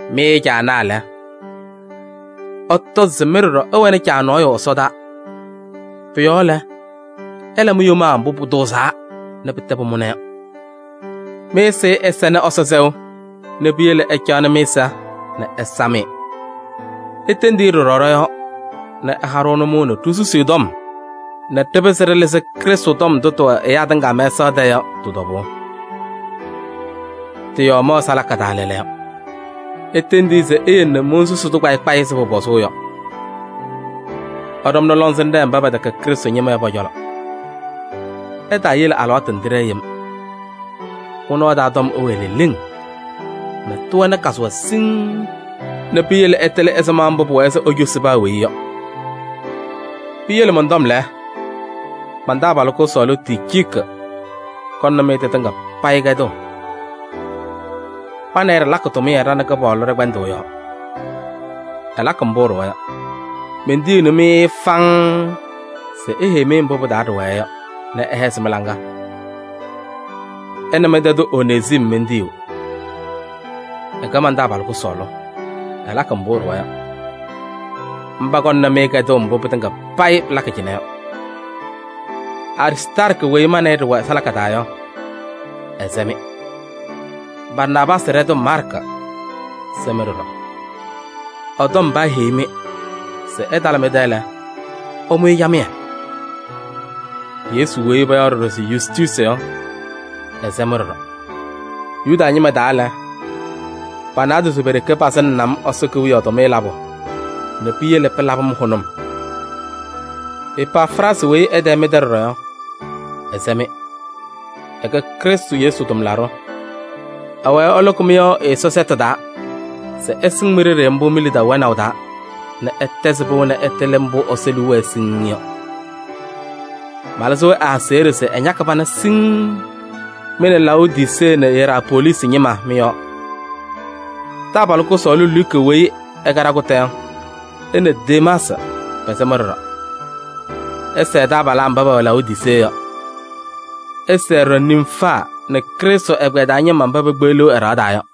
Mɩ caanaa lɛ, ɩtɔzɩ se mɩ ɖɔɖɔ ɩwɛnɩ Caa nɔɔyʋ ɛsɔdaa. Pʋ-yɔɔ lɛ, ɩla mi-yomaa mbʋ pʋtʋʋzaa nɛ pɩtɛ pʋmʋna yɔ. Mɩ-ɛzɩyɛ ɛsɛnɩ Ɛsɔ sɛʋ nɛ piyele ɩcaɣnɩ mɩ-ɛza nɛ ɩsam-ɩ. Itendi-i ɖɔɖɔ ɖɔ-yɔɔ nɛ ɛha-ɖʋ nʋmɔʋ nɛ ɖisusi ɛ-tɔm nɛ ɖɩpɩzɩ ɖɩlɩzɩ Krɩstʋ tɔm ndʋ tɩwɛ ɛyaa tɩŋa mɛsaɣ tɛɛ yɔ tɩ-tɔbʋʋ. Tɩ-yɔɔ mɛwɛ salaka taa lɛɛlɛɛyɔ. Itendi-i se eyele nɛ monsusi-tʋ kpayɩ kpayɩ ɛzɩ pʋpɔzʋʋ yɔ. Ɩɖɔmnɩ lɔŋsɩnɖɛ mba pɛtɛkɛ Krɩstʋ ñɩma yɔ pɔ-cɔlɔ. Ɩtaayele alɩwaatʋ nɛ tɩɖɛɛ yem. Mɩ-nɔɔ taa tɔm ɛwɛɛ leleŋ nɛ tɩwɛnɩ kazʋwa siŋŋ nɛ piyele ɩtɩlɩ ɛzɩma mbʋ pʋwɛɛ se icosi paa weyi yɔ. Piyele mɔn-tɔm lɛ, man-taabalʋ kʋsɔɔlʋ Ticiiki kɔŋnɩ-mɩ tɩtɩŋa payɩ kɛdʋʋ. Ma nɛ ɩ ɖɩlakɩ tʋmɩyɛ ɖa nɛ Kɩpaɣlʋ ɖɛ-kpɛndʋʋ yɔɔ. Ɛlakɩ mbʋ ɛɖʋwa yɔ. Mentiyiɣni-mɩ-ɩ faŋŋ se eheyi-mɩ mbʋ pɩ-taa ɖɩwɛɛ yɔ nɛ ɛhɛzɩ mɩ-laŋa. Ɛ nɛ mɩ-tɛ tʋ Onezim mentiyiɣ. Ɛkɛ man-taabalʋ kʋsɔɔlʋ, ɛlakɩ mbʋ ɛɖʋwa yɔ. Mba kɔŋnɩ-mɩ kɛdʋʋ mbʋ pɩtɩŋa payɩ pɩlakɩ cɩnɛ yɔ. Aristaarkɩ weyi ma nɛ ɩ ɖɩwɛ salaka taa yɔ, ɛsɛ-mɩ. Barnaabaasɩ ɖɛtʋ Maarkɩ sɛ-mɩ ɖɔɖɔ. Ɛ-tɔm paaheyi-mɩ se ɛtalɩ mɩ-tɛ lɛ, ɩmʋ-ɩ camɩyɛ. Yesu weyi payaɣ ɖɔɖɔ se Yustuusi yɔ, ɛsɛ-mɩ ɖɔɖɔ. Yuda ñɩma taa lɛ, pa-naadozo pe-ɖeke pasɩŋnɩnɩ-m Ɛsɔ Kewiyaɣ tʋmɩyɛ labʋ nɛ piyele pɩlabɩ-m hʋnʋm. Epafraasɩ weyi ɛ-tɛ mɩ-tɛ ɖɔɖɔ yɔ, ɛsɛ-mɩ. Ɛkɛ Krɩstʋ Yesu tʋmlaɖʋ, ɛwɛɛ ɛlʋkɩ mɩ-yɔɔ ɛ-Ɛsɔ sɛtʋ taa se ɩsɩŋ mi-ɖeɖe mbʋ mi-lidaʋ wɛnaʋ taa nɛ ɩtɛzɩ pɩʋ nɛ ɩtɩlɩ mbʋ Ɛsɔ liu wɛɛ yɔ siŋŋ. Malɩzɩɣ ɛ-aseɣɖe se ɛñakɩ pana siŋŋ mɩ nɛ Laodisee nɛ Iyerapoolisi ñɩma mɩ-yɔɔ. Taabalʋ kʋsɔɔlʋ Luka weyi ɛkɛ ɖakʋta yɔ nɛ Demaasɩ pɛsɛ-mɩ ɖɔɖɔ. Ɩsɛɛ taabalaa mba pɛwɛ Laodisee yɔ. Ɩsɛɛ ɖɔɖɔ Nimfaa nɛ Krɩstʋ ɛgbɛyɛ taa ñɩma mba pekpeɣliɣ ɛ-ɖɩɣa taa yɔ.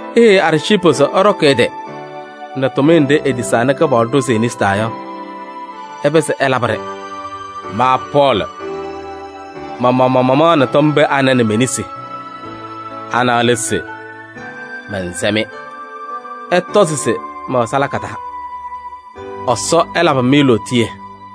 Iheyi Arciipu se ɛɖɔkɩ ɛ-tɩ nɛ tʋmɩyɛ nɖɩ etisaa nɛ Kɩpaɣlʋ ɖʋzɩ e-nesi taa yɔ nɛ ɛpɩzɩ ɛlabɩ-ɖɩ. Ma Pɔɔlɩ, ma-maɣmaɣ mamaɣnɩ tɔm pee anɛ nɛ me-nesi. Ana lɛ se: mɛnsɛ-mɩ. Ɩtɔzɩ se mɛwɛ salaka taa. Ɛsɔ ɛlabɩ-mɩ lootiye!